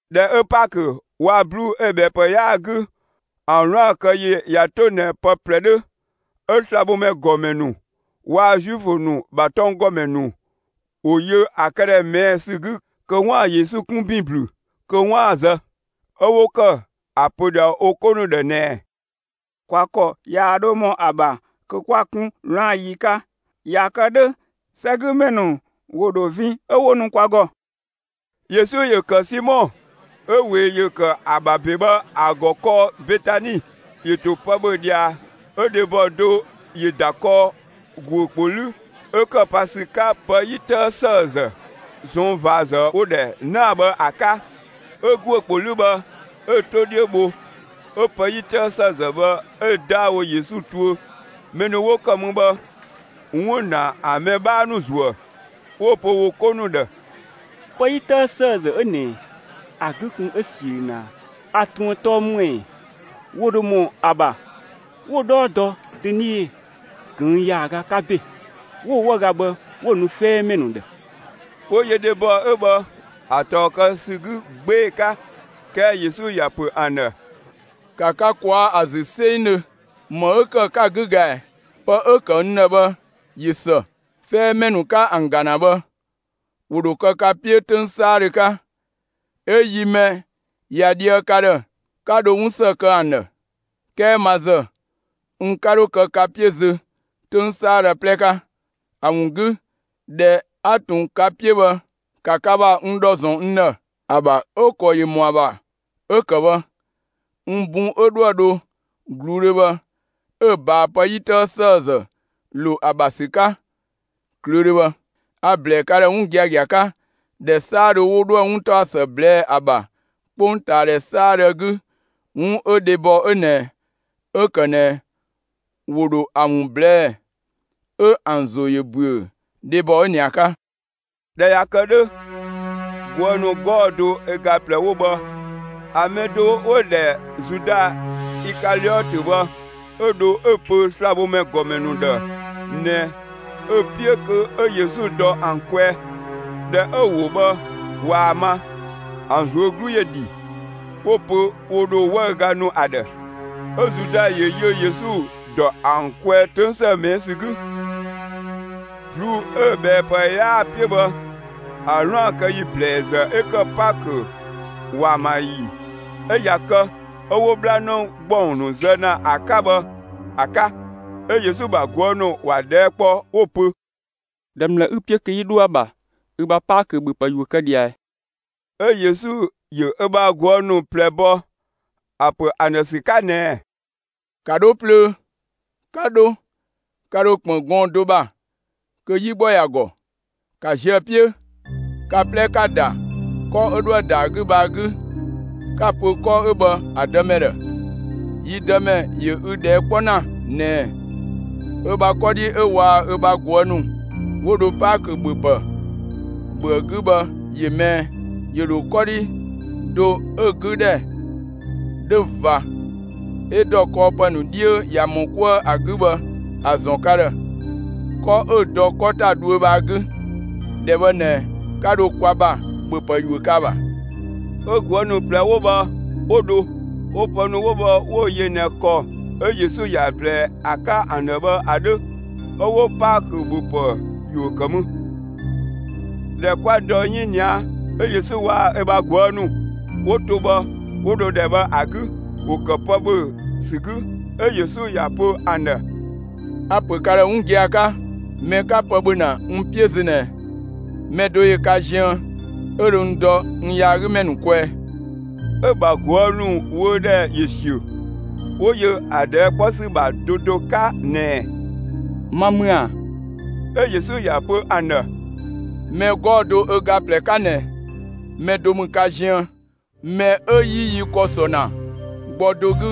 ꞊Dhɛ 'ö Paakö waa‑ ꞊bluu'‑ 'ö‑ ꞊bhɛɛpë 'yaa‑ 'gü, ‑an 'wlaan‑ kë yi ꞊ya 'to ꞊nɛ pë 'plɛ 'dhö, 'ö slabhomɛ ‑gɔmɛ ‑nu waa‑ Zuifö ‑nu ‑bha tɔnggɔmɛ ‑nu ‑wo yö ‑a këdhɛ ꞊mɛɛ' ‑sü 'gü kö 'waan‑ Yesu 'kun ‑bin ‑blü kö 'waan‑ ‑a zë. 'Ö 'wo ‑kë ‑a pö ꞊dhia wo 'ko ‑nu ‑dhë ꞊nɛɛ: «Kwa ‑kɔ yaa 'dho ‑mɔ ‑a ‑bha kö 'kwa‑ 'kun 'wlaan‑ ‑yi 'ka. ꞊Ya kë 'dhö, 'sɛgümɛ ‑nu ‑wo ‑dho vin 'ö 'wo nu kwa ‑gɔ.» Yesu ‑yö ‑kë Simɔ 'ö ꞊wee ‑yö ‑kë ‑a ‑bha ‑be bhë ‑a ‑gɔ kɔɔ Betani. ‑Yö ‑to pë ‑bhö ꞊dhia, 'ö dhebɔ do ‑yö ‑da kɔɔ ‑guö ‑kpo 'lü 'ö ‑kë pa ‑sü 'ka pë 'yi 'tëë ‑sëëzë ꞊sɔnng' ꞊vaazë 'wo‑ ‑dhɛ 'naa‑ bhë ‑a 'ka. 'Ö ‑guö ‑kpo 'lü bhë 'ö‑ 'to 'dhiö bho, 'ö pë 'yi 'tëë ‑sëëzë bhë 'ö‑ 'daawo Yesu tuö. Mɛ ‑nu 'wo ‑kë mü bhë 'wun ‑na ‑an mɛ 'bhaa ‑nu ‑zuë, 'wo‑ pö wo 'ko ‑nu ‑dhë: «Pë 'yi 'tëë ‑sëëzë 'ö ꞊nɛ, ‑a 'gü kun 'ö ‑siö ꞊nɛ ꞊a; ‑a ꞊truën 'ö tɔɔ ‑më ‑ɛ? ‑Wo ‑dho ‑mɔ ‑a ‑bha 'wo‑ 'dhɔɔ dɔ dönie ꞊këng' ‑yaaga 'ka ‑be, 'wo‑ 'wëüga bhë 'wo‑ nu 'fɛɛmɛ ‑nu ‑dhë!» 'Wo yö dhebɔ 'ö bhë ‑a ꞊tɔɔ kë ‑sü 'gü 'gbee‑ 'ka. 'Kɛɛ Yesu ‑ya ‑pö ‑an ‑dhë: «‑Ka ka ꞊kwaa' ‑a ‑zü 'sengdhö! ‑Më 'ö ‑kë 'ka‑ 'gü ga ꞊ɛ? Pë 'ö‑ ‑kë n ‑dhë bhë ꞊yö ‑së. 'Fɛɛmɛ ‑nu 'ka ‑an ‑ga ‑na bhë, ‑wo ‑dho kë ka 'piö 'töng 'saadhö 'ka. 'Ö‑ yi mɛ ꞊ya dhië ka ‑dhë, 'ka dho 'wun ‑së kë ‑an ‑dhë. 'Kɛɛ ma ‑zë, n 'ka 'dho kë ka 'piö zö 'töng 'saadhö 'plɛ 'ka. ‑A ‑wun 'gü, ꞊dhɛ 'a ꞊tun ka 'piö bhë, ‑ka ka ‑bha n ‑dhɔ ‑zɔn n ‑dhë. ‑A ‑bha 'ö‑ ‑kɔ ‑yö ‑mɔ ‑a ‑bha 'ö‑ ‑kë bhë, n bun 'ö 'dhoë‑ dho ꞊gluudhö bhë, 'ö‑ ꞊baa pë 'yi 'tëë ‑sëëzë ‑lo ‑a ‑bha ‑sü 'ka ꞊klöödhö bhë. A‑ ‑blɛɛ ka ‑dhë 'wun giagia 'ka: ‑Dhɛ 'saadhö 'wo 'dhoë‑ 'wuntaɔsë ꞊blɛɛ'‑ ‑a ‑bha 'kpongtaadhɛ 'saadhö ‑a 'gü, 'wun 'ö dhebɔ 'ö ꞊nɛ 'ö‑ ‑kë ꞊nɛ, ‑wo ‑dho ‑a ‑wun ꞊blɛɛ'‑, 'ö ‑an ‑zo ‑yö ‑büö dhebɔ 'ö ꞊nɛ ‑a 'ka.» ꞊Dhɛ ꞊ya kë 'dhö, ꞊guë' ‑nu 'gɔɔ‑ do ö ga ꞊plɛ 'wo bhë, ‑a mɛ do 'wo‑ ‑dhɛ Zuda Ikaliɔtö bhë, 'ö dho 'ö‑ pö slabhomɛ ‑gɔmɛ ‑nu ‑dhë ꞊nɛ ö‑ 'piö kö 'ö Yesu dɔ ‑an kwɛɛ. ꞊Dhɛ 'ö‑ ‑wo bhë ꞊waa‑ ma, ‑an ꞊zuö' 'glu ‑yö ‑dhi, 'wo‑ pö ‑wo ‑dho 'wëüga nu ‑a ‑dhë. 'Ö Zuda ‑yö yö Yesu ‑dɔ ‑an kwɛɛ 'töng ‑së ꞊mɛɛ' ‑sü 'gü. ꞊Bluu'‑ 'ö‑ ꞊bhɛɛpë 'yaa‑ 'piö bhë, ‑a 'wlaan‑ kë ‑yi ‑blɛɛzë 'ö ‑kë Paakö ‑waamayi, 'ö ꞊ya kë 'ö 'wo 'bhlanë ‑gbɔng ‑nu zë ‑na ‑a 'ka bhë ‑a 'ka, 'ö Yesu ‑bha ꞊guë' ‑nu ‑wa ꞊dhɛɛ' kpɔ 'wo‑ pö: «‑Dhɛ ‑mlë 'ü‑ 'piö kö 'yi dho ‑a ‑bha ü ‑bha Paakö ‑bhöpë ‑yuö kë ꞊dhia ꞊ɛ?» 'Ö Yesu ‑yö ö bha ꞊guë' ‑nu ꞊plɛ bɔ, ‑a ‑pö ‑an ‑dhë ‑sü 'ka ꞊nɛɛ: «‑Ka 'dho plöö; 'ka 'dho, 'ka ‑dho ‑kpën gɔɔn‑ do ‑bha kö 'yi ‑gbɔ ‑ya ‑gɔ; ‑ka ziö ‑a 'piö! Ka 'plɛ ‑ka ‑da 'kɔ 'ö 'dhoë‑ ‑da ‑a 'gü bhë ‑a 'gü 'ka‑ pö 'kɔ 'ö bhë ‑a dëmɛ ‑dhë: ‹Yi Dëmɛ ‑yö ü ꞊dhɛɛ' 'kpɔ ‑na ꞊nɛɛ: Ö bha 'kɔdhi 'ö waa‑ ö bha ꞊guë' ‑nu 'wo dho Paakö ‑bhöpë ‑bhö ‑a 'gü bhë, ‑yö më ꞊ɛ?› ‑Yö ‑dho 'kɔdhi do 'ö‑ 'gü ‑dhɛ 'dhö ꞊va 'ö ‑dɔ kɔɔpë ‑nu 'dhiö ꞊ya ‑mɔ 'kuë ‑a 'gü bhë ‑a ‑zɔn ka ‑dhë, 'kɔ 'ö dɔ 'kɔ ‑ta dhuö bhë ‑a 'gü. ‑Dhɛ bhë ꞊nɛ, 'ka dho kwa ‑bha ‑bhöpë ‑yuö kë ‑a ‑bha.» 'Ö ꞊guë' ‑nu ꞊plɛ 'wo bhë 'wo dho, 'wo pë ‑nu 'wo bhë 'wo‑ yö ꞊nɛ ‑kɔ 'ö Yesu ‑ya ꞊blɛɛ ‑a 'ka ‑an ‑dhë bhë ‑a 'dhö, 'ö 'wo Paakö ‑bhöpë ‑yuö ‑kë mü. ꞊Dhɛ 'kwa dɔ 'yinia, 'ö Yesu waa‑ ö bha ꞊guë' ‑nu 'wo to bhë, 'wo dho ‑dhɛ bhë ‑a 'gü. ‑Wo ‑kë pë ‑bhö ‑sü 'gü, 'ö Yesu ‑ya ‑pö ‑an ‑dhë: «A‑ ‑pö ka ‑dhë 'wun gia‑ 'ka: Mɛ 'ka pë ‑bhö ‑na n 'piö zö ꞊nɛ, mɛ do ‑yö ka ziën 'ö dho n dɔ n yaagümɛ ‑nu kwɛɛ.» 'Ö‑ ‑bha ꞊guë' ‑nu wöödhɛ ‑yö ‑siö, 'wo yö ‑a ꞊dhɛɛ' 'kpɔ ‑sü ‑bha do do 'ka ꞊nɛɛ: «Ma ‑mü ‑a?» 'Ö Yesu ‑ya pö ‑an ‑dhë: «Mɛ 'gɔɔ‑ do ö ga ꞊plɛ 'ka ꞊nɛ, mɛ do ‑mü ka ziën, mɛ 'ö 'yi yi ‑kɔ ‑sɔ ‑na gbɔ dɔ 'gü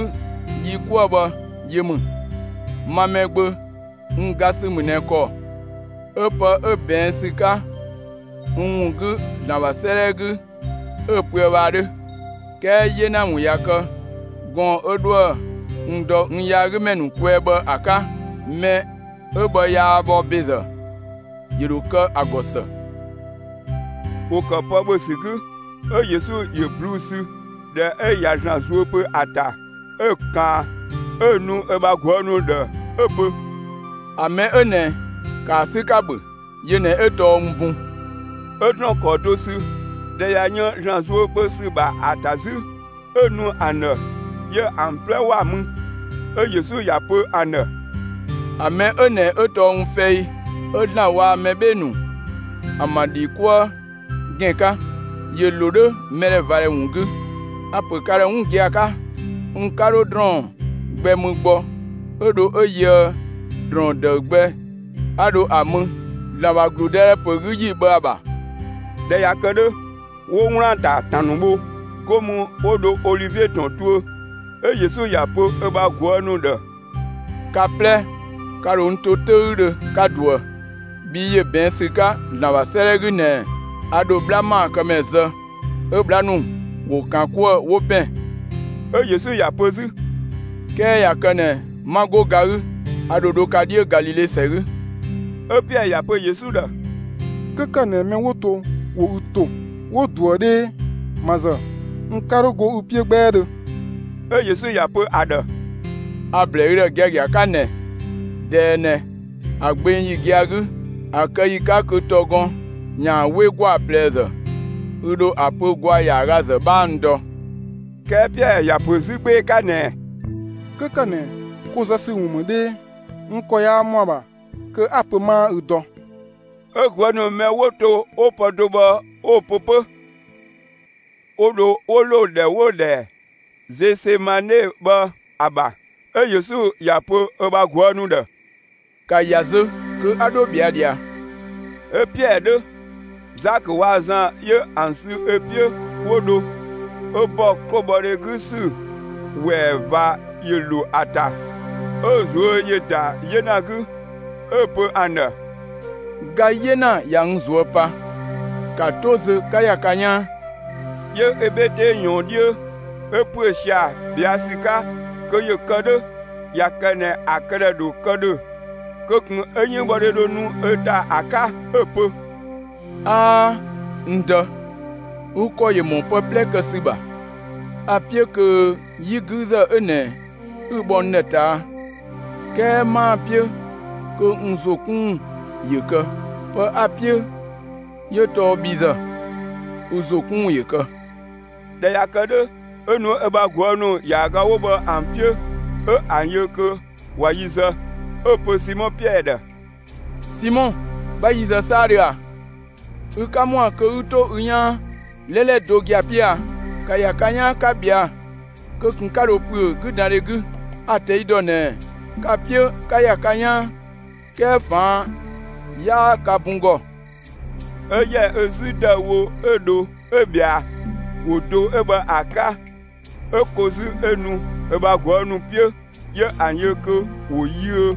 yi 'kuë bhë yö ‑mü. Ma Mɛgbö, n ga ‑sü ‑mü ꞊nɛ ‑kɔ 'ö pë 'ö ꞊bɛɛn' ‑sü 'ka n ‑wun 'gü ‑Zlan ‑bha 'sëëdhɛ 'gü, 'ö‑ pöë bhë ‑a 'dhö. 'Kɛɛ 'yena ‑wun ꞊ya kë gɔɔn‑ 'ö 'dhoë‑ n dɔ n yaagümɛ ‑nu kwɛɛ bhë ‑a 'ka! Mɛ 'ö bhë yaa bhɔ ‑bezë, ‑yö ‑dho kë ‑a ‑gɔ ‑së!» ‑Wo ‑kë pë ‑bhö ‑sü 'gü, 'ö Yesu ‑yö ꞊bluu'‑ ‑sü. ꞊Dhɛ 'ö ꞊ya ‑Zlan zuö pö ‑a ‑ta, 'ö‑ ‑kaan 'ö‑ nu ö bha ꞊guë' ‑nu ‑dhë 'ö‑ pö: «‑A mɛ 'ö ꞊nɛ, ‑kaa 'sü, 'ka‑ ‑bhö, yö ꞊nɛ 'ö tɔɔ n bun.» 'Ö ‑drɔɔn ‑kɔɔ do sü. ꞊Dhɛ ꞊ya yën ‑Zlan zuö pö ‑sü ‑bha ‑a ‑ta 'zü, 'ö‑ nu ‑an ‑dhë, 'yö ‑an 'plɛ ‑wa mü. 'Ö Yesu ‑ya pö ‑an ‑dhë: «‑A mɛ 'ö ꞊nɛ 'ö tɔɔ n fɛi, 'ö ‑Zlan waa‑ mɛ 'bhee‑ ‑nu ‑an ‑bha ‑dhi 'kuë gën 'ka; ‑yö ‑lo 'dhö mɛdhɛvadhɛ ‑wun 'gü. A‑ ‑pö ka ‑dhë 'wun gia‑ 'ka: N 'ka 'dho ‑drɔɔn gbɛ mü gbɔ 'ö dho 'ö yöë ‑drɔɔn ‑dëü gbɛ 'a dho ‑a mü ‑Zlan ‑bha ‑gludëdhɛ ‑pö 'gü yi ‑bha ‑a ‑bha.» ꞊Dhɛ ꞊ya kë 'dhö, 'wo 'wlaan‑ ‑ta ‑tan ‑nu bho. 'Go mü, 'wo dho Olivie ‑tɔn tuö. 'Ö Yesu ‑ya pö ö bha ꞊guë' ‑nu ‑dhë: «Ka 'plɛ, ka ‑dho n to 'töüdhö, 'ka ꞊duë. Bhii ‑yö ꞊bɛɛn' ‑sü 'ka ‑Zlan ‑bha 'sëëdhɛ 'gü ꞊nɛɛ: A ‑dho 'bhla ‑maakëmɛ zë, 'ö 'bhla ‑nu ‑wo ‑kan 'kuë‑, 'wo ‑pɛn.» 'Ö Yesu ‑ya pö 'zü: «'Kɛɛ ꞊ya kë ꞊nɛ, 'ma 'go ga 'gü, a ‑dho dho ka 'dhiö Galile ‑sɛ 'gü.» 'Ö Piɛɛ ‑ya pö Yesu ‑dhë: «'Kö ‑kë ꞊nɛ mɛ 'wo to ‑wo ü ‑to, 'wo ꞊duë 'dhee, ma ‑zë, n 'ka 'dho go ü 'piö 'gbɛɛdhö.» 'Ö Yesu ‑ya pö ‑a ‑dhë: «A‑ ‑blɛɛ ü ‑dhë giagia 'ka ꞊nɛ, ꞊dɛɛ ꞊nɛ, ‑a gbeng ‑yi gia‑ 'gü, ‑a kë ‑yi 'ka kö ‑tɔgɔn ‑yaan 'we ‑gwaa ꞊plɛzë, ü ‑dho ‑a pö ‑gwaa ‑yaagazë 'bhaa n dɔ.» 'Kɛɛ Piɛɛ ‑ya ‑pö 'zü 'gbee‑ 'ka ꞊nɛɛ: «'Kö ‑kë ꞊nɛ, ko zë ‑sü ‑wun ‑mü 'dhee, n ‑kɔ yaa ‑mɔ ‑a ‑bha kö 'a‑ pö 'maa ü dɔ!» 'Ö ꞊guë' ‑nu mɛ 'wo to 'wo pë do bhë 'wo‑ pö 'pö. ‑Wo ‑dho 'wo ‑lo ‑dhɛ 'wo‑ ‑dhɛ Zesemane bhë ‑a ‑bha. 'Ö Yesu ‑ya pö ö bha ꞊guë' ‑nu ‑dhë: «‑Ka ‑ya zö kö 'a 'dho ꞊bhɛa' ꞊dhia!» 'Ö Piɛɛ 'dhö, Zakö waa‑ Zan 'yö ‑an sü ö 'piö, 'wo dho. 'Ö ‑bɔ 'klobhɔdhe 'gü ‑sü ‑wɛɛ ꞊va ‑yö ‑lo ‑a ‑ta; 'ö‑ ꞊zuö' ‑yö ‑da 'yena 'gü. 'Ö‑ pö ‑an ‑dhë: «Ga 'yena ꞊ya n ꞊zuö' pa. ‑Ka 'to zö 'ka ‑ya ka 'yaan!» 'Yö ö 'bhe 'tee ꞊yɔɔn 'dhiö, 'ö ‑püö sia‑ ꞊bhɛa' ‑sü 'ka kö ‑yö kë 'dhö ꞊ya kë ꞊nɛ ‑a këdhɛ ‑dho kë ‑dhö kö ꞊kun 'ö 'yënngbhɔdhe dho nu ö ‑ta ‑a 'ka. 'Ö‑ pö: «'Aa, n Dë! Ü ‑kɔ ‑yö ‑mɔ pë 'plɛ kë ‑sü ‑bha. A‑ 'piö kö 'yi 'güüzë 'ö ꞊nɛ 'ü‑ bhɔ n ‑dhë ꞊taa', 'kɛɛ 'maa‑ 'piö kö n ‑zo 'kun ‑wun ‑yö kë, pë 'a‑ 'piö 'yö tɔɔ bhi ‑zë, ü ‑zo 'kun ‑wun ‑yö kë.» ꞊Dhɛ ꞊ya kë 'dhö, 'ö nu ö bha ꞊guë' ‑nu ‑yaaga 'wo bhë ‑an 'piö, 'ö ‑an yö kö ꞊wa yi zë, 'ö‑ pö Simɔ Piɛɛ ‑dhë: «Simɔ, 'bha yi zë 'saadhö ꞊a? Ü 'ka ‑mɔa kö 'ü 'to ü 'yaan 'lɛlɛ do gia‑ 'piö a? ‑Ka ‑ya ka 'yaan 'ka ꞊bhɛa'‑, kö ꞊kun 'ka dho ‑püö 'güdandhe 'gü! A‑ ꞊tɛi' ‑dɔ ꞊nɛ ka‑ 'piö 'ka ‑ya ka 'yaan, 'kɛɛ ꞊faan' 'yaa ka bun ‑gɔ.» 'Ö ‑yɛ ö 'zü ‑dëüwo, 'ö dho 'ö ꞊bhɛa, ‑wo do 'ö bhë ‑a 'ka. 'Ö ko 'zü, 'ö nu ö bha ꞊guë' ‑nu 'piö. 'Yö ‑an yö kö ‑wo yiö;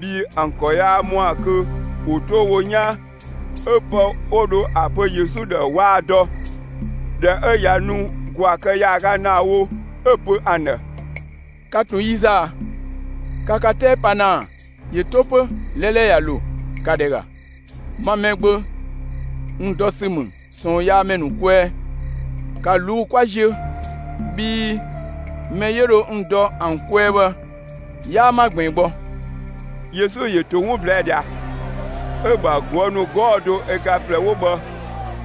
bhii ‑an ‑kɔ yaa ‑mɔa kö ‑wo 'to wo 'yaan. 'Ö pë 'wo dho ‑a pö Yesu ‑dhë waa‑ dɔ. ꞊Dhɛ 'ö ꞊ya nu ‑gwaa kë ‑yaaga ‑naa wo, 'ö‑ pö ‑an ‑dhë: «Ka ꞊tun yi zë ꞊a? Ka ka 'tɛɛ pa ‑na ‑a? ‑Yö 'to 'pö, 'lɛlɛ ꞊ya ‑lo. ‑Ka ‑dhɛ ‑ga, ma Mɛgbö, n dɔ ‑sü ‑mü ꞊sɔɔnyaamɛ ‑nu kwɛɛ. ‑Ka ꞊luu'‑ 'kwa ziö, bhii mɛ 'yö dho n dɔ ‑an kwɛɛ bhë 'yaa 'ma ꞊gbiin gbɔ.» Yesu ‑yö ‑to 'wun ꞊blɛɛ' ꞊dhia, 'ö‑ ‑bha ꞊guë' ‑nu 'gɔɔ‑ do ö ga ꞊plɛ 'wo bhë,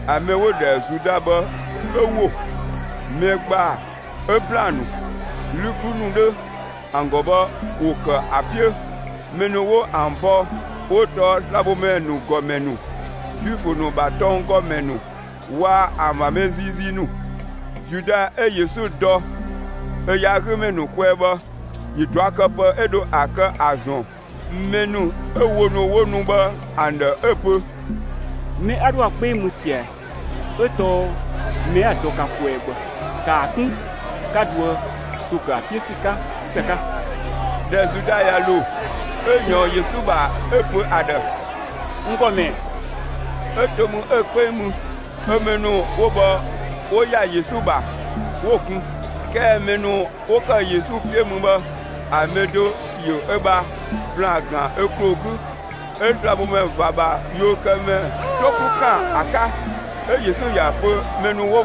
‑a mɛ 'wo‑ ‑dhɛ Zuda bhë 'ö ‑wo. Mɛ ‑gbaa 'ö ‑blaan ‑nu, 'lü 'klu ‑nu 'dhö ‑an ‑gɔ bhë ‑wo ‑kë ‑a 'piö. Mɛ ‑nu 'wo ‑an bɔ 'wo tɔɔ slabhomɛ ‑nu ‑gɔmɛ ‑nu, Zuifö ‑nu ‑bha tɔng ‑gɔmɛ ‑nu, waa‑ ‑an ‑bha mɛ ziizii ‑nu. Zuda 'ö Yesu dɔ ö yaagümɛ ‑nu kwɛɛ bhë ‑yö ꞊duakëpë 'ö dho ‑a kë ‑a ‑zɔn mɛ ‑nu 'ö wo ‑nu 'wo nu bhë ‑an ‑dhë 'ö‑ pö: «Mɛ 'a 'dhoë‑ ‑a 'kpeng mü ꞊sia, 'ö tɔɔ mɛ 'a‑ dɔ ka kwɛɛ bhë. ‑Kaa 'kun, 'ka dhoë ‑zo ‑kë ‑a 'piö ‑sü 'ka ‑së 'ka!» ꞊Dhɛ Zuda ꞊ya ‑lo, 'ö ꞊yɔɔn Yesu ‑bha, 'ö‑ pö ‑a ‑dhë: «N ‑Gɔmɛ!» 'ö to mü 'ö‑ 'kpeng mü. 'Ö mɛ ‑nu 'wo bhë 'wo ‑ya Yesu ‑bha, 'wo‑ kun. 'Kɛɛ mɛ ‑nu 'wo ‑kë Yesu 'piö mü bhë, ‑a mɛ do ‑yö ö ‑bha ‑blaan ‑gan ö ‑kloo 'gü, 'ö slabhomɛ ꞊va ‑bha yuökëmɛ 'to 'klu ‑kan ‑a 'ka. 'Ö Yesu ‑ya pö mɛ ‑nu 'wo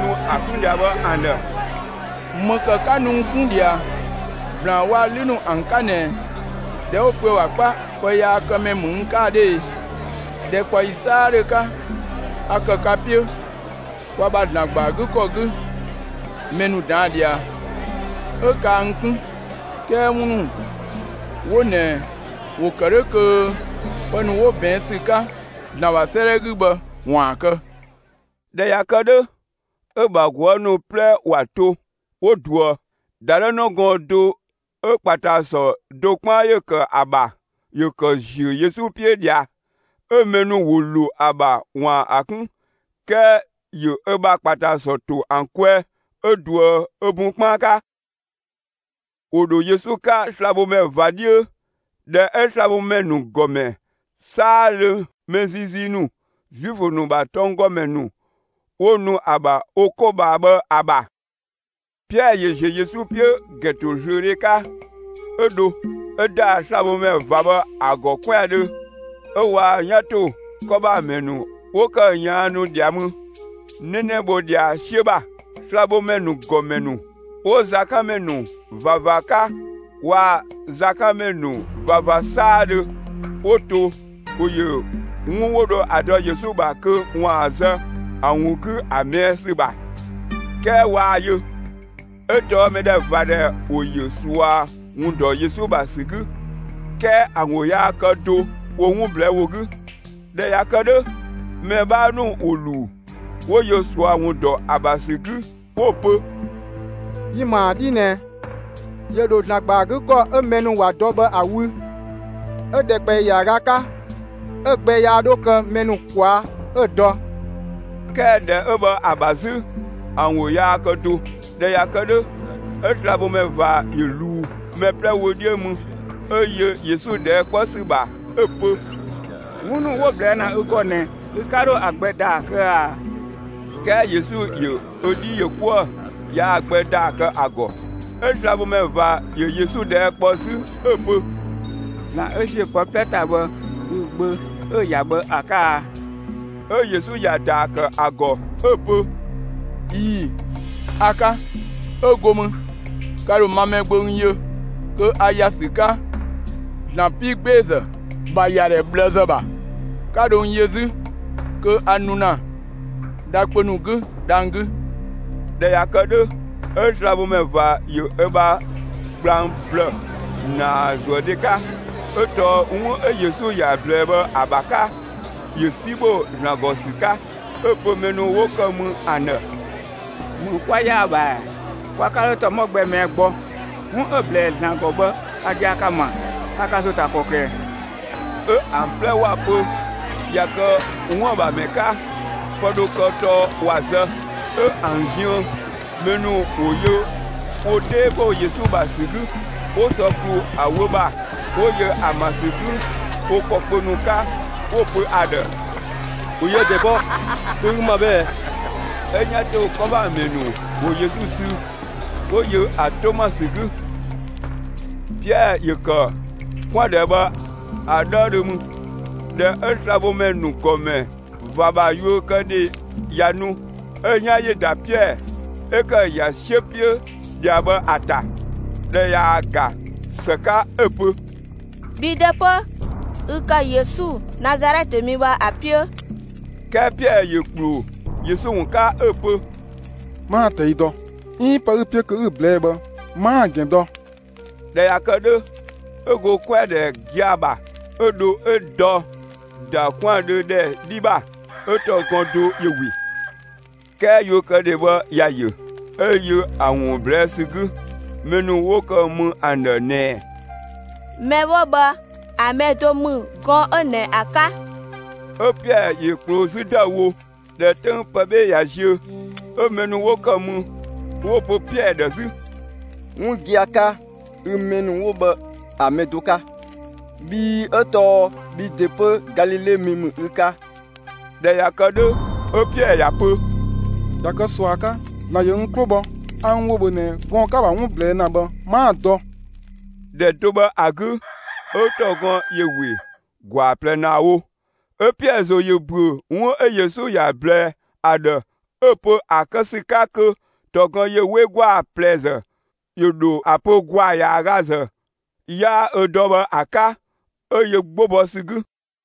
nu ‑a 'kun ꞊dhia bhë ‑an ‑dhë: «‑Më ‑kë 'ka nu n 'kun ꞊dhia, ‑blaan waa‑ 'lü ‑nu ‑an 'ka ꞊nɛ ꞊dhɛ 'wo‑ pö ‑a ‑bha 'kpa pëyaakëmɛ ‑mü n 'ka ‑a 'dhö e? ‑Dhɛkpaɔyi 'saadhö 'ka, a ‑kë ka 'piö, kwa ‑bha ‑Zlan ‑gba ‑a 'gü ‑kɔ 'gü, mɛ ‑nu ꞊daan' ꞊dhia, 'ö kaa n 'kun. 'Kɛɛ 'wun ‑nu 'wo ꞊nɛ ‑wo ‑kë 'dhö kö pë ‑nu 'wo ꞊bɛɛn' ‑sü 'ka ‑Zlan ‑bha 'sëëdhɛ 'gü bhë ‑waan kë.» ꞊Dhɛ ꞊ya kë 'dhö, 'ö‑ ‑bha ꞊guë' ‑nu 'plɛ ‑wa to, 'wo ꞊duë. ‑Dadhëü gɔɔn‑ do ö ‑kpatasɔ do 'kpaan ‑yö ‑kë ‑a ‑bha, ‑yö ‑kë ‑ziö Yesu 'piö ꞊dhia. 'Ö mɛ ‑nu ‑wo ‑lo ‑a ‑bha ‑waan ‑a 'kun, 'kɛɛ ‑yö ö ‑bha ‑kpatasɔ ‑to ‑an kwɛɛ, 'ö ꞊duë ö bun 'kpaan 'ka. ‑Wo ‑dho Yesu 'ka slabhomɛ ꞊va 'dhiö, ‑dhɛ 'ö slabhomɛ ‑nu ‑gɔmɛ 'saadhö, mɛ ziizii ‑nu, Zuifö ‑nu ‑bha tɔnggɔmɛ ‑nu 'wo nu ‑a ‑bha wo 'ko ꞊bhaa bhë ‑a ‑bha. Piɛɛ ‑yö ‑ziö Yesu 'piö ‑gɛntozlöödhe 'ka, 'ö dho, 'ö ‑da slabhomɛ ꞊va bhë ‑a ‑gɔ 'kwɛandhö. 'Ö waa‑ 'yan ‑to 'kɔ ‑bha ‑mɛ ‑nu 'wo ‑kë ꞊yaannu ꞊dhia mü, 'nɛnɛ ‑bho ꞊dhia 'siö ‑bha. Slabhomɛ ‑nu ‑gɔmɛ ‑nu 'wo zakanmɛ ‑nu ꞊vava 'ka waa‑ zakanmɛ ‑nu ꞊vava 'saadhö 'wo to, ‑wo ‑yö 'wun 'wo dho ‑a dɔ Yesu ‑bha kö 'waan‑ zë ‑a ‑wun 'gü ‑a ꞊mɛɛ' ‑sü ‑bha, 'kɛɛ waa‑ yö. 'Ö tɔɔ mɛdhɛvadhɛ ‑wo ‑yö ꞊sua ‑wun ‑dɔ Yesu ‑bha ‑sü 'gü, 'kɛɛ ‑an ‑wo yaa kë do wo 'wun ꞊blɛɛ' ‑wo 'gü. ꞊Dhɛ ꞊ya kë 'dhö, mɛ 'bhaa ‑nu ‑wo ‑luu, 'wo yö ꞊sua ‑wun ‑dɔ ‑a ‑bha ‑sü 'gü 'wo‑ pö: «Yi‑ ‑ma ‑a 'dhii ꞊nɛ, ‑yö ‑dho ‑Zlan ‑gba ‑a 'gü ‑kɔ 'ö mɛ ‑nu ‑wa dɔ bhë ‑a wü, 'ö ‑dhɛkpaɔyi ‑yaaga 'ka 'ö‑ gbɛ 'ö yaa 'dho kë mɛ ‑nu ꞊kwaa' 'ö‑ dɔ.» 'Kɛɛ ‑dhɛ 'ö bhë ‑a ‑bha 'zü ‑an ‑wo yaa kë do. ꞊Dhɛ ꞊ya kë 'dhö, 'ö slabhomɛ ꞊va ‑yö ꞊luu mɛ 'plɛ wö 'dhiö mü, 'ö yö Yesu ꞊dhɛɛ' 'kpɔ ‑sü ‑bha 'ö‑ pö: «'Wun ‑nu 'wo‑ ꞊blɛɛ' ‑na ü ‑gɔ ꞊nɛ, ü 'ka 'dho ‑a gbɛ ‑daa kë ꞊a?» 'Kɛɛ Yesu ‑yö ö 'dhi ‑yö 'kuë‑, yaa‑ gbɛ ‑daa kë ‑a ‑gɔ. 'Ö slabhomɛ ꞊va ‑yö Yesu ꞊dhɛɛ' kpɔ 'zü, 'ö‑ pö: «‑Zlan 'ö ‑ziö pë 'plɛ ‑ta bhë, ü‑ Gbö 'ö ü ‑ya bhë ‑a 'ka a?» 'Ö Yesu ‑ya ‑daa ‑kë ‑a ‑gɔ 'ö‑ pö: «꞊Ii‑, a‑ 'ka. 'Ö go mü, ka ‑dho ma Mɛgbö n yö kö a ‑ya ‑sü 'ka ‑Zlan 'piigbeezë ‑bha ‑yadhɛ ꞊bhlëzë ‑bha, 'ka dho n yö 'zü, kö a nu ‑na dha kpö ‑nu 'gü dhang‑ 'gü.» ꞊Dhɛ ꞊ya kë 'dhö, 'ö slabhomɛ ꞊va ‑yö ö bha gblang ‑blë (‑naazuëdhe 'ka, 'ö tɔɔ 'wun 'ö Yesu ‑ya ꞊blɛɛ bhë ‑a ‑bha 'ka, ‑yö 'si ‑bho ‑Zlan ‑gɔ ‑sü 'ka). 'Ö‑ pö mɛ ‑nu 'wo ‑kë mü ‑an ‑dhë: «‑Më 'kwa‑ ‑yaa ‑bha ‑ɛ? Kwa 'ka 'dho ‑tɔmɔ gbɛ ꞊mɛɛ' gbɔ! 'Wun 'ö‑ ꞊blɛɛ ‑Zlan ‑gɔ bhë ka gia‑ ka‑ ‑ma. Ka ka ‑zo ‑ta ‑kɔklë ꞊ɛ?» 'Ö ‑an 'plɛ ‑wa pö ꞊ya kë 'wuën‑ ‑bha ‑mɛ 'ka, pë dho kë tɔɔ ‑wa zë. 'Ö ‑an ziën, mɛ ‑nu ‑wo yö wo 'dhee ‑bho Yesu ‑bha ‑sü 'gü, 'wo sɔ ‑klu ‑a wö ‑bha, 'wo yö ‑a ‑ma ‑sü 'gü wo ‑kɔ kpö ‑nu 'ka; 'wo‑ pö ‑a ‑dhë: «‑Bhö yië‑ ‑dɛ bɔ, dö 'ö ü ‑ma bhë ꞊ɛ?» 'Ö 'yan ‑to 'kɔ ‑bha ‑mɛ ‑nu ‑wo Yesu sü, 'wo yö ‑a 'to ‑ma ‑sü 'gü. Piɛɛ ‑yö ‑kë 'kwɛandhɛ bhë ‑a 'dhëëdhö mü. ꞊Dhɛ 'ö slabhomɛ ‑nu ‑gɔmɛ ꞊va ‑bha yuökëdhe ꞊ya nu, 'ö‑ 'yan ‑yö ‑da Piɛɛ 'ö ‑kë ‑ya 'siö 'piö ꞊dhia bhë, ‑a ‑ta. ꞊Dhɛ ꞊yaa‑ ‑ga ‑së 'ka 'ö‑ pö: «Bhi ‑de 'pö ü ‑kë Yesu, Nazalɛtë mi bhë, ‑a 'piö.» 'Kɛɛ Piɛɛ ‑yö ‑kploo Yesu ‑wun 'ka 'ö‑ pö: «'Maa‑ ꞊tɛi' dɔ, 'iin pë 'ü‑ 'piö kö 'ü‑ ꞊blɛɛ'‑ bhë 'maa‑ ‑gɛn dɔ.» ꞊Dhɛ ꞊ya kë 'dhö, 'ö go 'kwɛandhɛ gia‑ ‑bha, 'ö dho 'ö dɔ ‑da 'kwɛandhö ‑dhɛ 'dhi ‑bha. 'Ö ‑tɔgɔn do ‑yö ‑we. 'Kɛɛ yuökëdhe bhë ‑ya ‑yö, 'ö yö ‑a ‑wun ꞊blɛɛ' ‑sü 'gü, mɛ ‑nu 'wo ‑kë mü ‑an ‑dhë ꞊nɛɛ: «Mɛ 'wo bhë ‑a mɛ do ‑mü gɔɔn‑ 'ö ꞊nɛ ‑a 'ka!» 'Ö Piɛɛ ‑yö ‑kploo 'zü ‑dëüwo. ꞊Dhɛ 'töng pë 'bhe ꞊ya ziö, 'ö mɛ ‑nu 'wo ‑kë mü, 'wo‑ pö Piɛɛ ‑dhë 'zü: «'Wun gia‑ 'ka, ü mɛ ‑nu 'wo bhë ‑a mɛ do 'ka, bhii 'ö tɔɔ bhi ‑de 'pö Galile mi ‑mü ü 'ka!» ꞊Dhɛ ꞊ya kë 'dhö, 'ö Piɛɛ ‑ya pö: «꞊Ya kë ꞊sua 'ka, ‑Zlan ‑yö n 'klo bhɔ, a n ‑wo ‑bhö ꞊nɛ gɔɔn‑ 'ka‑ ‑bha 'wun ꞊blɛɛ' ‑na bhë 'maa‑ dɔ.» ‑Dhɛ do bhë ‑a 'gü, 'ö ‑tɔgɔn ‑yö ‑we ‑gwaa ꞊plɛ ‑naa wo. 'Ö Piɛɛ ‑zo ‑yö ‑büö, 'wun 'ö Yesu ‑ya ꞊blɛɛ ‑a ‑dhë 'ö‑ pö ‑a kë ‑sü 'ka kö ‑tɔgɔn ‑yö 'we ‑gwaa ꞊plɛzë, ‑yö ‑dho ‑a pö ‑gwaa ‑yaagazë, 'yaa ö dɔ bhë ‑a 'ka. 'Ö yö 'gbo bɔ ‑sü 'gü.